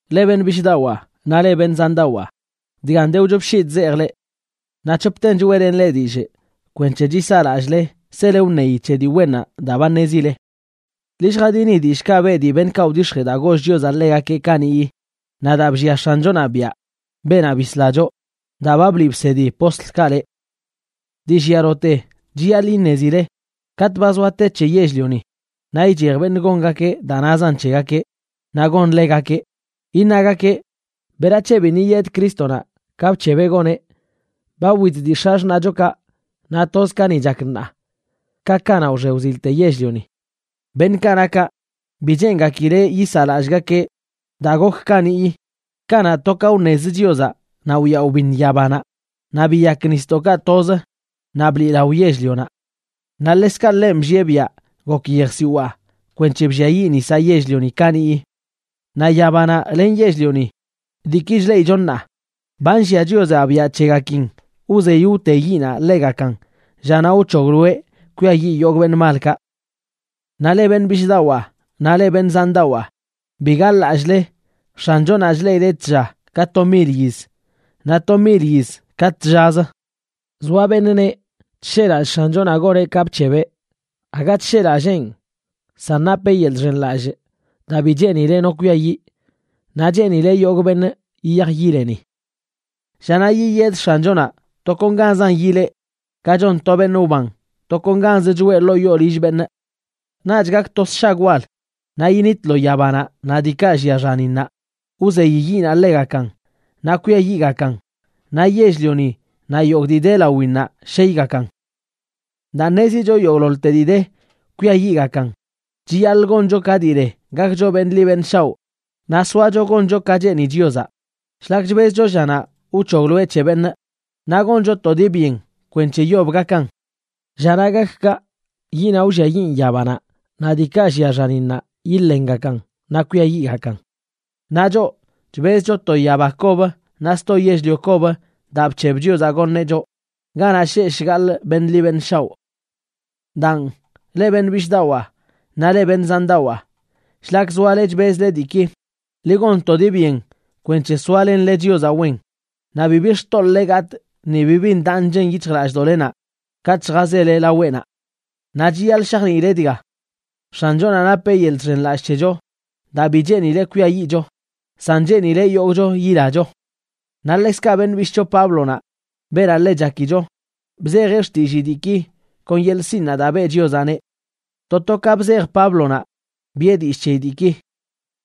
Leꞌ beṉꞌ bishꞌdawaa naꞌ leꞌ beṉꞌ zandawaa, dgan de wchop shii chzejꞌ leꞌ. Naꞌ c̱hopten choeꞌlenꞌ leꞌ dillꞌ kwenc̱he chisaa lallꞌle sele wṉeyi c̱he dii wennaꞌ daa ba ṉezile. Ḻi lljadini dillꞌkaꞌ beꞌ dii beṉꞌkaꞌ wdix̱jee daa goll Chiozaꞌ ḻegakeꞌ kaniꞌyi, naꞌ daa bllia X̱anchonaꞌ biaꞌ, beenaꞌ bisla choꞌ, daa ba bliꞌ bsedi postlkaꞌ leꞌ. Dii llialote chiyaḻꞌ iṉezile, katꞌ ba zoa te c̱he yell-lioni, naꞌ ichej beṉꞌ gongakeꞌ daa nazan c̱hegakeꞌ naꞌ gonḻegakeꞌ, iṉagakeꞌ: “¿Berac̱he biṉꞌ yiyed Crístonaꞌ ka bc̱hebeꞌ goneꞌ? Ba wit dii x̱axṉaꞌchokaꞌ naꞌ toz ka ni chak ṉaa ka kanaꞌ wxe wzilte yell-lioni.” Beṉꞌkaꞌ na kaꞌ, bi cheengakileꞌ yisaꞌlallꞌgakeꞌ daa gok kaniꞌyi, kanaꞌ to ka wṉezə Chiozaꞌ naꞌ wyaꞌ wbiṉ yabanaꞌ, naꞌ biyak nisdoꞌkaꞌ toz naꞌ bliꞌlao yell-lionaꞌ. Naꞌ ḻekzkaꞌ ḻenꞌ bllieꞌ biaꞌ gok yejsiwaa kwenc̱he blliayiꞌ nisaꞌ yell-lioni kaniꞌyi. Naꞌ yabanaꞌ len yell-lioni, diiki chleꞌicho ṉaa, ba nllia Chiozaꞌ biaꞌ c̱hegakin wzey wte yiꞌnaꞌ ḻegakan llanaꞌ wc̱hogloeꞌ kwiayiꞌ yogꞌ beṉꞌ malkaꞌ. Naꞌ leꞌ beṉꞌ bishꞌdawaa naꞌ leꞌ beṉꞌ zandawaa, bi gaḻ-lallꞌle X̱anchonaꞌ chleꞌileꞌ tlla ka to mil yiz naꞌ to mil yiz ka tllazə. Zoa beṉꞌ neꞌ chsheꞌlallꞌ X̱anchonaꞌ goneꞌ ka bc̱hebeꞌ. Aga chsheꞌlalleenꞌ, san napeꞌ yeḻꞌ chxenlallꞌ daa bi cheenileꞌ no kwiayiꞌ, naꞌ cheenileꞌ yogꞌ beṉꞌ yiyaj yileni. Llanaꞌ yiyed X̱anchonaꞌ tokonganzan yilee, ka chon to beṉꞌ wban tokonganz choꞌe ḻoo yoo lill beṉꞌ. Naꞌch gak to sshag wal naꞌ yinitlo yabanaꞌ naꞌ diikaꞌ llia xaninnaꞌ, wzey yiꞌnaꞌ ḻegakan naꞌ kwiayiꞌgakan, naꞌ yell-lioni naꞌ yogꞌ dii de lawinnaꞌ sheygakan. Daa ṉezicho yogꞌḻoḻte dii de kwiayiꞌgakan, chiyaḻꞌ goncho ka dii le gakcho beṉꞌ ḻi beṉꞌ shaoꞌ naꞌ soacho goncho ka cheeni Chiozaꞌ shlak chbezcho llanaꞌ wc̱hogloeꞌ c̱he beṉꞌ, naꞌ goncho to dii byen kwenc̱he yob gakan. Llanaꞌ gak kaꞌ, yiꞌnaꞌ wlliayiꞌn yabanaꞌ naꞌ diikaꞌ llia xaninnaꞌ yiḻengakan naꞌ kwiayiꞌgakan. Naꞌ choꞌ, chbezcho to yaba kob naꞌ sto yell-lio kob daa bc̱heb Chiozaꞌ goṉeꞌ choꞌ ganaꞌ sheꞌ shgaḻꞌ beṉꞌ ḻi beṉꞌ shaoꞌ. Daan, leꞌ beṉꞌ bishꞌdawaa naꞌ leꞌ beṉꞌ zandawaa, shlak zoale chbezle diiki, ḻi gon to dii byen kwenc̱he soalenle Chiozaꞌ wen, naꞌ bibi xtoḻꞌle gatꞌ ni bibi ndaꞌ nchen yic̱hjlallꞌdoꞌlenaꞌ katꞌ lljazele laweꞌnaꞌ. Naꞌ chiyaḻꞌ shajniileꞌ dga: X̱anchonaꞌ napeꞌ yeḻꞌ chxenlallꞌ c̱hecho daa bi cheenileꞌ kwiayiꞌcho, san cheenileꞌ yogꞌcho yilacho. Naꞌ ḻekzkaꞌ beṉꞌ bishꞌcho Páblonaꞌ, beenaꞌ ḻe chakicho, bzejeꞌ xtillii diiki kon yeḻꞌ sinꞌ daa beꞌ Chiozaꞌneꞌ. To to ka bzej Páblonaꞌ, biꞌe dillꞌ c̱he diiki.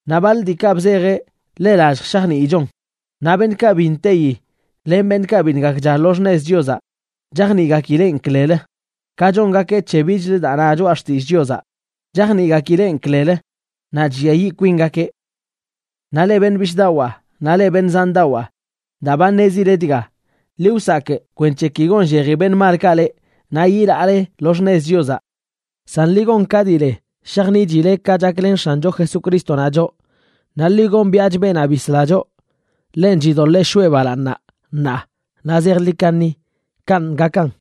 Naꞌ baḻ diikaꞌ bzejeꞌ ḻe lallj shajniichon, naꞌ beṉꞌkaꞌ bi nteyi len beṉꞌkaꞌ biṉꞌ gakcha lo xṉez Chiozaꞌ chajniꞌgakileꞌn klelə, ka chongakeꞌ c̱he bichlə daa na Choꞌa Xtillꞌ Chiozaꞌ, chajniꞌgakileꞌn klelə, naꞌ chlliayiꞌ kwingakeꞌ. Naꞌ leꞌ beṉꞌ bishꞌdawaa naꞌ leꞌ beṉꞌ zandawaa, daa ba ṉezile dga, ḻi wsakꞌ kwenc̱he ki gonlleji beṉꞌ malkaꞌ leꞌ naꞌ yilaale lo xṉez Chiozaꞌ. San ḻi gon ka dii le shajniꞌchile ka chaklen X̱ancho Jesucrístonaꞌ choꞌ, naꞌ ḻi gombiaꞌch beenaꞌ bisleꞌ choꞌ. Ḻenꞌ chidoḻee shoꞌe balaaṉ ṉaa naꞌ zejḻi kaṉi. Kanꞌ gakan.